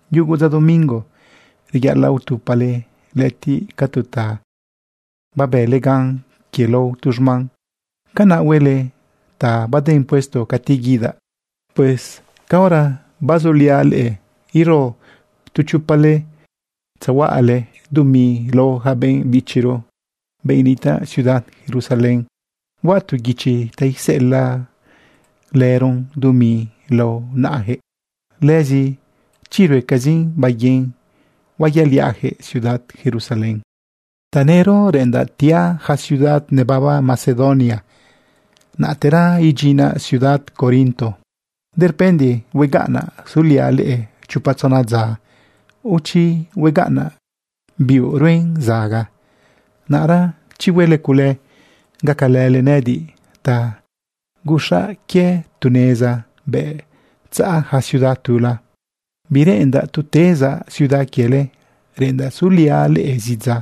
Yugu dza domingo reyaꞌalaꞌ utupale lëꞌëtiꞌ ca tu ta babële gan quie lao tu xman. Canaꞌ huele ta baden puesto cati guidaꞌ. Pues caora bazuliaꞌ leꞌe, ero tu chopale tzehuaꞌayaquëꞌ dumi lao yaca benꞌ bichiro, benꞌ nitaꞌ ciudad Jerusalén. Huaꞌ tu guichi ta iseꞌelaꞌlëron dumi lao naꞌayaquëꞌ. Lëzi chi ruecazin baiguin, huayaꞌliaꞌyaquëꞌ ciudad Jerusalén. Tanëro reꞌendaꞌ tiaꞌ yaca ciudad nebaba Macedonia, naꞌtera idyinaꞌ ciudad Corinto. Durpende huegaꞌnaꞌ suliaꞌ leꞌe chopa tzona dza, o chi huegaꞌnaꞌ biuꞌ ruen zaga. Naꞌra chi huele cule, gacalële nëꞌëdiꞌ ta guxaꞌ quie tu neza bëꞌ tzaꞌa yaca ciudad tula. Bireꞌendaꞌ tu tezaꞌ ciudad quiele, reꞌendaꞌ suliaꞌ leꞌe zi dza,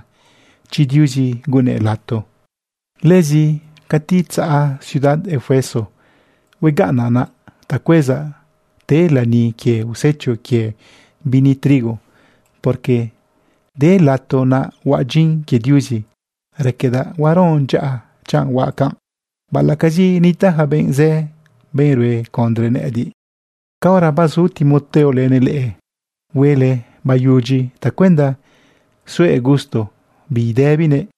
chi Diuzi gunnëꞌ lato. Lëzi cati tzaꞌa ciudad Efeso, huegaꞌnaꞌ naꞌ ta cuezaꞌ te lani quie usecho quie bini trigo, porque de lato naꞌ huaꞌ dyin quie Diuzi. Raquedaꞌ huaron dyaꞌa chanꞌ huaꞌ canꞌ, baꞌalaꞌcazi nitaꞌ yaca benꞌ zë, benꞌ rue condre nëꞌëdiꞌ. Caora bazu Timoteo lënëꞌ leꞌe, huele bayudyi tacuenda suëꞌ gusto bidëbinëꞌ.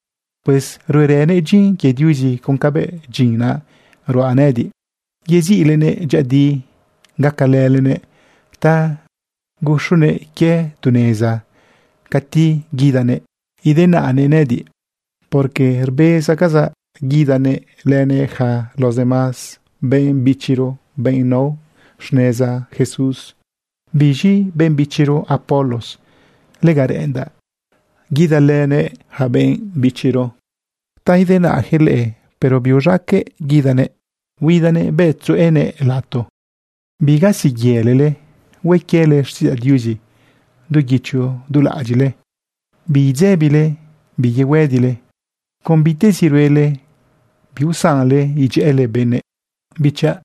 Pues ruerënëꞌ dyin quie Diuzi con cabëꞌ dyin naꞌ ruaꞌ nëꞌëdiꞌ. Yeziꞌlenëꞌ dyëꞌëdi gacalëlenëꞌ ta guxunëꞌ quie tu neza cati guidanëꞌ idenaꞌnëꞌ nëꞌëdiꞌ, porque rbezcazaꞌ guidanëꞌ lënëꞌ yaca los demás benꞌ bichiro, benꞌ nao xneza Jesús. Biz̃i benꞌ bichiro Apolos, lega reꞌendaꞌ guidalënëꞌ yaca benꞌ bichiro ta idenaꞌyaquëꞌ leꞌe, pero biuz̃aqueꞌ guidanëꞌ. Huidanëꞌ bëꞌ tzuꞌunëꞌ lato. Bigasiyëlale, hue quiele xtiꞌidzaꞌ Diuzi du guicho du laꞌadyiꞌle. Bidzebile, biyehuëdile. Con bitezi ruele, biusanle idyëꞌële benëꞌ. Bichaꞌ,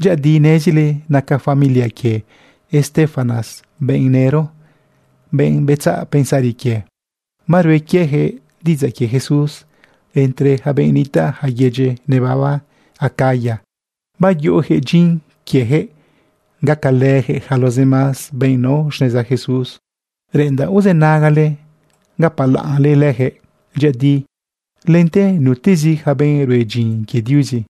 dyëꞌëdi nezile naca familia quie Estéfanas benꞌ nëro, benꞌ betzaꞌ pensari quie, barue quieyaquëꞌ diꞌidzaꞌ quie Jesús entre yaca benꞌ nitaꞌ yaca yedyi nebaba Acaya. Bayuꞌuyaquëꞌ dyin quieyaquëꞌ gacalëyaquëꞌ yaca los demás benꞌ nao xneza Jesús. Reꞌendaꞌ uzënagale gapalaꞌnle leyaquëꞌ dyëꞌëdi lente nutezi yaca benꞌ rue dyin quie Diuzi.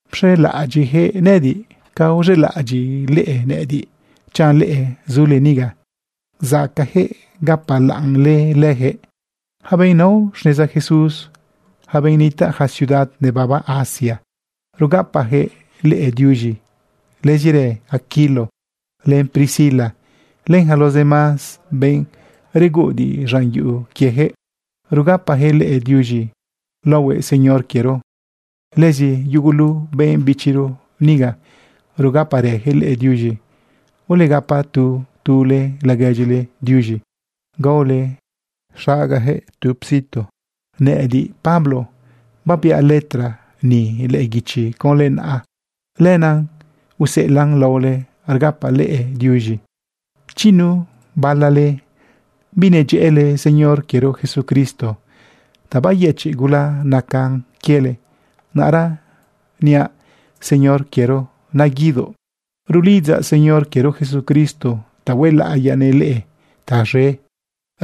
Pxelaꞌadyiꞌyaquëꞌ nëꞌëdiꞌ ca uxelaꞌadyiꞌle nëꞌëdiꞌ chanꞌ leꞌe zule niga. Zacaꞌyaquëꞌ gapalaꞌnle leyaquëꞌ. Yaca benꞌ nao xneza Jesús, yaca benꞌ nitaꞌ yaca ciudad nebaba Asia, rugapayaquëꞌ leꞌe diuz̃i. Lëzirë Aquilo len Priscila, len yaca los demás benꞌ reguꞌudiꞌ z̃an yuꞌu quieyaquëꞌ, rugapayaquëꞌ leꞌe diuz̃i laohue Señor quiero. Lëzi yugulu benꞌ bichiro niga, rugaparëyaquëꞌ leꞌe diuz̃i. Ulegapa tu tule laguedyile diuz̃i, gaole xagayaquëꞌ tu situ. Nëꞌëdiꞌ, Pablo, babiaꞌ letra ni lëꞌë guichi conlë naꞌa. Lenaꞌ useꞌelaꞌn laole rgapaꞌ leꞌe diuz̃i. Chi nu bala leꞌe binedyëꞌële Señor quiero Jesucristo, ta bayëchiꞌ gula nacan quiele. Naꞌra niaꞌ Señor quiero, naguidoꞌ. Rulidzaꞌ Señor quiero Jesucristo ta huelaꞌiyanëꞌ leꞌe taz̃e.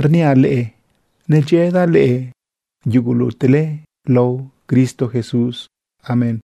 Rniaꞌ leꞌe nedyëꞌëdaꞌ leꞌe yugulutele laohue Cristo Jesús. Amén.